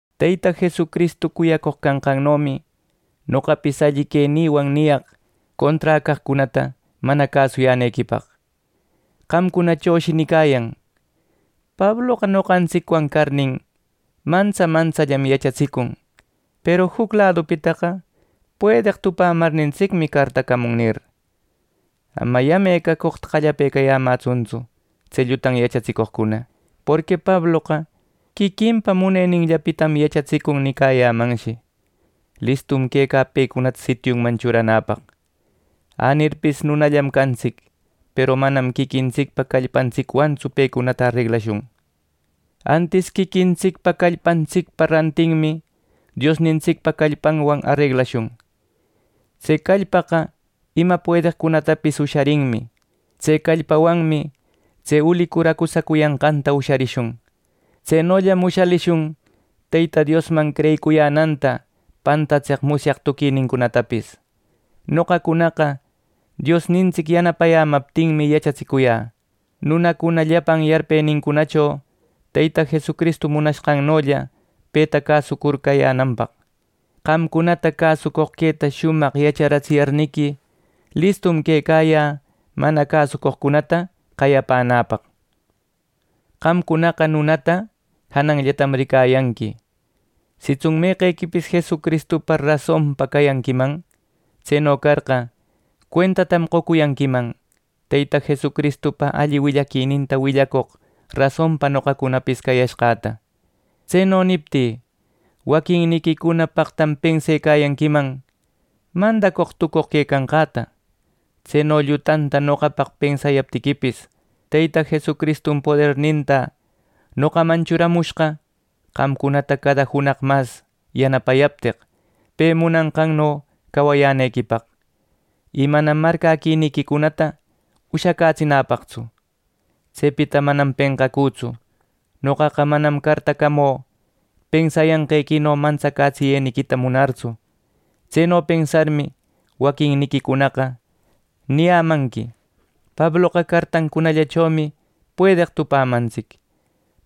Teyta Jesucristu cuyacoq canqannomi noqapis alli quenïwan niyaq conträ caqcunata mana cäsuyänequipaq. Qamcunachoshi nicayan: “Pabloqa noqantsicwan carnin, mantsa mantsallam yachatsicun. Peru juc ladupitaqa puedeq tupämarnintsicmi cartacamun” nir. Ama yame cacoqta qallapecayämätsuntsu tse llutan yachatsicoqcuna, porqui “Pabloqa quiquinpa muneninllapitam yachatsicun” nicayämanshi. Listum quecä pecunata sitiunman churanäpaq. Anirpis nunallam cantsic, peru manam quiquintsicpa callpantsicwantsu pecunata areglashun. Antis quiquintsicpa callpantsicpa rantinmi Diosnintsicpa callpanwan areglashun. Tse callpaqa ima puedeqcunatapis usharinmi. Tse callpawanmi tse ulicur acusacuyanqanta usharishun. Tsenolla ushalishun Teyta Diosman creyicuyänanta pantatseq musyaq tuquinincunatapis. Noqancunaqa Diosnintsic yanapayämaptinmi yachatsicuyä, nunacuna llapan yarpenincunacho, Teyta Jesucristu munanqannolla peta cäsucur cayänanpaq. Qamcunata cäsucoq queta shumaq yacharatsiyarniqui, listum quecayä mana cäsucoqcunata qayapänäpaq. Qamcunaqa nunata jananllatam ricayanqui. Sitsun meqequipis Jesucristupa rasonpa cayanquiman, tseno carqa, cuentatam qocuyanquiman Teyta Jesucristupa alli willaquininta willacoq rasonpa noqacunapis cayashqäta. Tseno niptï, waquinniquicuna paqtam pensecayanquiman mandacoq tucoq quecanqäta. Tseno llutanta noqapaq pensayaptiquipis, Teyta Jesucristum poderninta noqaman churamushqa qamcunata cada junaq mas yanapayapteq, pe munanqanno cawayänequipaq. Y manam marcäquiniquicunata ushacätsinapaqtsu. Tsepita manam penqacütsu. Noqaqa manam cartacamü pensayanqequino mantsacätsiyeniquita munartsu. Tseno pensarmi, waquinniquicunaqa niyämanqui: “Pabloqa cartancunallachomi puedeq tupämantsic.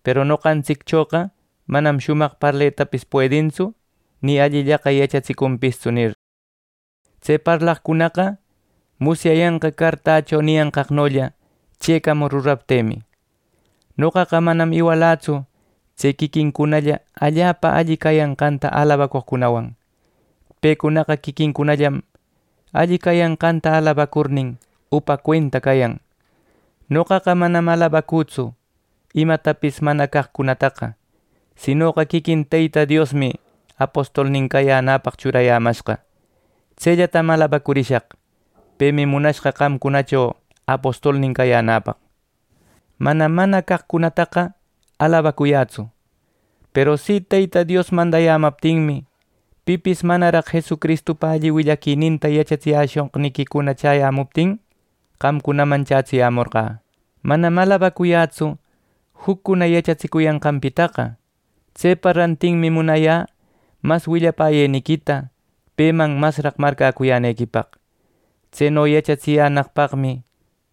Peru nopantsicchoqa manam shumaq parletapis puedintsu, ni allillaqa yachatsicunpistsu” nir. Tse parlaqcunaqa musyayanqa cartächo niyanqaqnolla chëcamur ruraptïmi. Noqaqa manam iwalätsu tse quiquincunalla allapa alli cayanqanta alabacoqcunawan. Pecunaqa quiquincunallam alli cayanqanta alabacurnin, upa cuenta cayan. Noqaqa manam alabacütsu imatapis mana caqcunataqa; sinoqa quiquin Teyta Diosmi apostolnin cayänäpaq churayämashqa. Tsellatam alabacurishaq. Pemi munashqa qamcunacho apostolnin cayänäpaq. Manam mana caqcunataqa alabacuyätsu. Peru si Teyta Dios mandamaptinmi, pipis manaraq Jesucristupa alli willaquininta yachatsiyäshoqniquicuna chäyämuptin qamcunaman chätsimorqä. Manam alabacuyätsu juccuna yachatsicuyanqanpitaqa. Tsepa rantinmi munayä mas willapäyeniquita peman masraq marcäcuyänequipaq. Tseno yachatsiyänaqpaqmi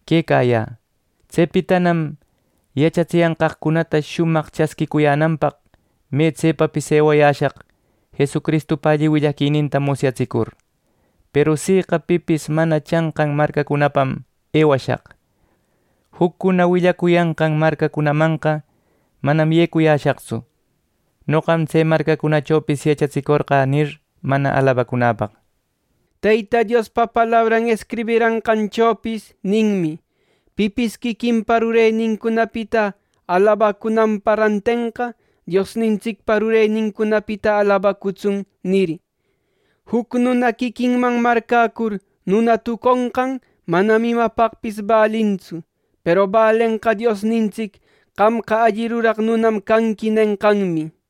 quecayä. Tsepitanam yachatsenqäcunata shumaq chasquïcuyänanpaq me tsepapis ewashaq Jesucristupa alli willaquininta musyatsicur. Peru siqa pipis mana chanqan marcacunapam ewashaq. Juccuna willacuyanqan marcacunamanqa manam yecushaqtsu “Noqam tse marcacunachopis yachatsicorqä” nir, mana alabacunäpaq. Teyta Diospa palabran escribiranqanchopis ninmi: “Pipis quiquinpa rurenincunapita alabacunanpa rantenqa Diosnintsicpa rurenincunapita alabacutsun” nir. Juc nuna quiquinman marcäcur nuna tuconqan manam imapaqpis balintsu. Peru balenqa Diosnintsic “Qamqa alli ruraq nunam canqui” nenqanmi.